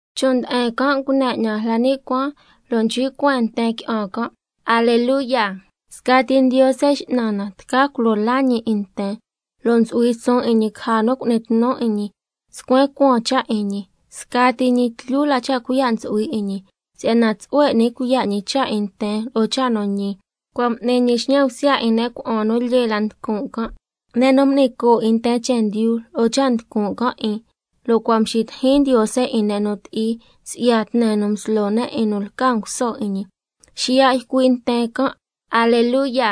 Chon' nde'en can' ngune 'ñan la ni' cuaan, lo' nchcui' cueen nten qui'an can': ¡Aleluya! Scati Ndiose X'nan na tca culo laa ñi 'in nten, lo' ntsu'hui suun 'in ñi caja nu cu'ni tnu 'in ñi, scuen cuaan cha' 'in ñi, scati ñi tlyu la cha' cuiya' ntsu'hui 'in ñi, si'yana tsu'hue n'ni cuiya' ñi cha' 'in nten lo'o cha' nu ñi, cua' m'ni ñi xñan bsya 'in ne' cuna'an nu lyee la nducun' can', ne' nu m'ni coo' 'in nten chendyu lo'o cha' nducun' can' 'in, lo' cua' mxitijin Ndiose 'in ne' nu ti'i si'ya tne nu mslo ne' 'in nu lca nguso 'in ñi. Xiya' ycui' nten can': ¡Aleluya!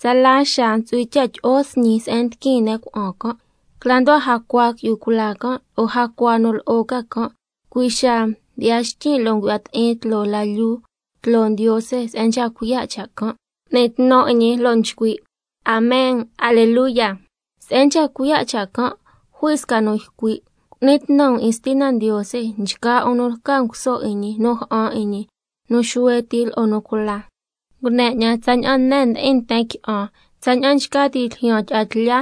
Tsala xaa ntsu'hui cha' tyi'o sñi se'en ndiquin ne' cuna'an can'. Cla nducua jacua qui'yu cula can', lo'o jacua nu lo'o ca can', cui' xaa mdyi'ya xtyin' lo' ngu'ya ti'in tloo la lyuu tloo Ndiose se'en nchca cuiya' cha' can', m'ni tnu 'in ñi, lo' nchcui': ¡Amen! ¡Aleluya! Se'en nchca cuiya' cha' can' jui sca nu ycui': Cu'ni tnu um 'in Stina Ndiose nchgaa 'un nu lca nguso 'in ñi nu ja'an 'in ñi, nu xuhue ti lo'o nu cula. Ngune 'ñan tsaña'an ne se'en ndi'in nten qui'an, tsaña'an nchca ti' ljyaan tyi'a tlya,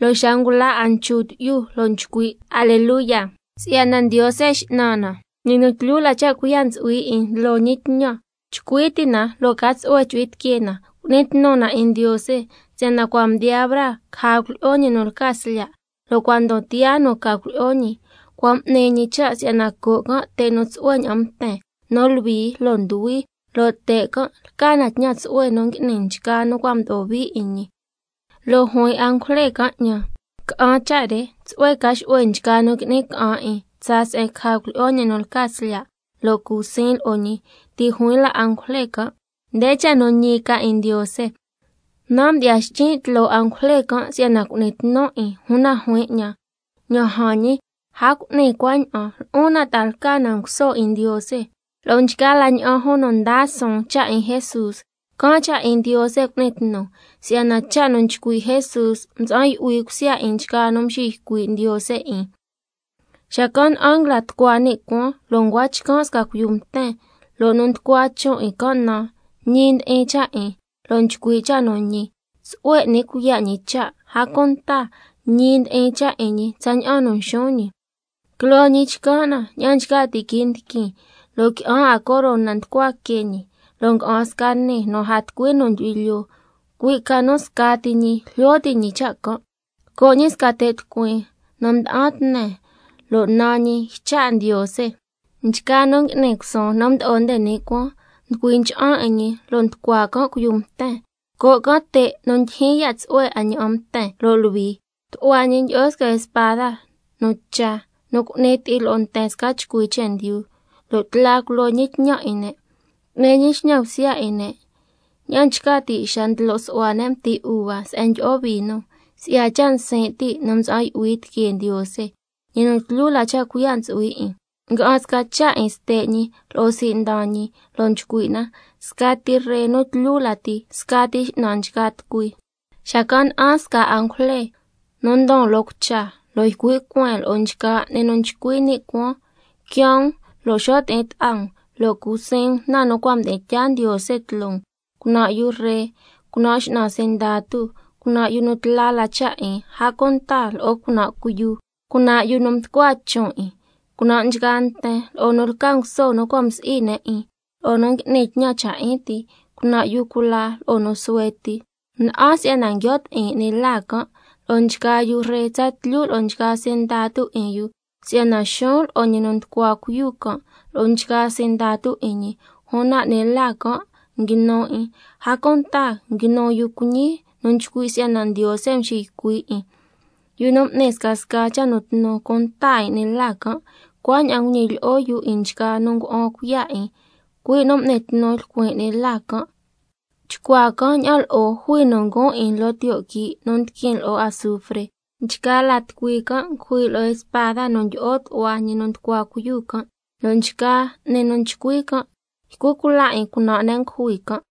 lo'o xa ngula 'a nchu tyi'yu, lo' nchcui': ¡Aleluya, si'yana Ndiose X'nan na, ñi nu tlyu la cha' cuiya' ntsu'hui 'in ndlo ñi tñan! Chcui ti' na lo' ca tsu'hue chu'hui tiquee na, cu'ni tnu na 'in Ndiose, si'yana cua' mdiyaa braa caja cuilyi'o ñi nu lca Slya', lo' cua' ndon tiyaa nu ca cuilyi'o ñi. Cua' m'ni ñi cha' si'yana co' can' te' nu tsu'hue ña'an mten, nu luhui lo' nduhui, lo' te' can' lca tñan tsu'hue nu ngui'ni nchgaa nu cua' mdo'o hui 'in ñi. Lo' juin angujle can' 'ñan: Ca'an cha' re: Tsu'hue ca xu'hue nchgaa nu qui'ni ca'an 'in tsaa se'en caja cuilyi'o ñi nu lca Slya', lo' cu siin lo'o ñi. Ti' juin la angujle can': Nde cha' nu ñi ca 'in Ndiose. Nan' mdyi'ya xtyin' tloo angujle can' si'yana cu'nin tnun 'in, una juin 'ñan: Ña'an jan ñi, a cu'ni cuaña'an, lo'on nan' ta'a lca na nguso 'in Ndiose, lo'o nchgaa la ña'an jun nu ndaa suun cha' 'in Jesús. Can' cha' 'in Ndiose cu'ni tnu, si'yana cha' nu nchcui' Jesús ntsa'an yu'hui cusya 'in nchgaa nu nxiycui' Ndiose 'in. Xacan' na'an nguila tucua ni' cuaan, lo' ncua chcan' sca cuiyu mten, lo' nu nducua chon' 'in can' naan: Ñi ndi'in cha' 'in, lo' Nchcui' cha' nu ñi. Tsu'hue n'ni cuiya' ñi cha', a cunta ñi ndi'in cha' 'in ñi tsaña'an nu nxuun ñi. Quiloo ñi chcan' na tsaña'an nchca ti' quii' ndiquin, lo' qui'an 'a corona nducua que ñi, lo' nga'an sca nii nu a tucui nu ndyu'hui lyoo, cui' ca nu scati ñi jlyo ti' ñi cha' can'. Lco' ñi sca te' tucuin nu mda'an tne, lo' naan ñi: Ycha' Ndiose. Nchgaa nu ngui'ni cusuun nu mdo'o nde ni' cuaan, nducui ncha'an 'in ñi lo' nducua can' cuiyu mten, lco' can' te' nu ndyijyin ya' tsu'hue 'a ña'an mten lo' luhui. Tu'hua ñi ndyi'o sca spada nu cha, nu cu'ni ti'i lo'o nten sca chcui chendyu, lo' tla culo ñi tñan 'in ne', cu'ni ñi xñan bsya 'in ne' ña'an nchca ti' xa ndlo su'hua ne' mti uva se'en tyi'o vino, si'ya cha' nsin' ti' nu mtsa'an yu'hui tiquee Ndiose, ñi nu tlyu la cha' cuiya' ntsu'hui 'in. Nga'an sca cha' 'in ste' ñi lo'o sii' ndan ñi, lo' nchcui' na: Scati Ree nu tlyu lati, scati X'nan nchgaa tucui. Xacan' na'an sca angujle nu ndon loo cucha, lo' ycui' cueen lo'o nchgaa 'ni nu nchcui ni' cuaan: Quiaan um lo' xo' ti'in ta'a um, lo' cu siin um na nu cua' mdi'in tyaa Ndiose tloo um: Cunan' yu ree, cunan' x'nan sindatu, cunan' yu nu tla la cha' 'in, a cunta lo'o cunan' cuiyu, cunan' yu nu mducua chon' 'in, cunan' nchgaa nten, lo'o nu lca nguso nu cua' msi'i ne' 'in, lo'o nu ngui'ni tñan cha' 'in ti, cunan' yu cula lo'o nu suhue ti. Na'an si'yana nguio' ti'in 'ni la can' lo'o nchgaa yu ree tsatlyu lo'o nchgaa sindatu 'in yu, si'yana xuun lo'o ñi nu nducua cuiyu can' lo'o nchgaa sindatu 'in ñi. Una 'ni la can' nguinu 'in, a cunta nguinu yu cuiñi nu nchcui' si'yana Ndiose nxiycui' 'in, yu nu m'ni scasca cha' nu tnu cunta 'in 'ni la can', cuaña'an nguñilyi'o yu 'in nchgaa nu ngua'an cuiya' 'in, cui' nu m'ni tnu lcuin 'ni la can'. Chcuaa can' ña'an lo'o jui nu nguun 'in loo tiyo' quii' nu ndiquin lo'o azufre. Nchgaa la tucui can' ngujui lo'o spada nu ndyi'o tu'hua ñi nu nducua cuiyu can', lo' nchgaa 'ni nu nchcui can' ycu cula' 'in cunan' ne' ngujui can'.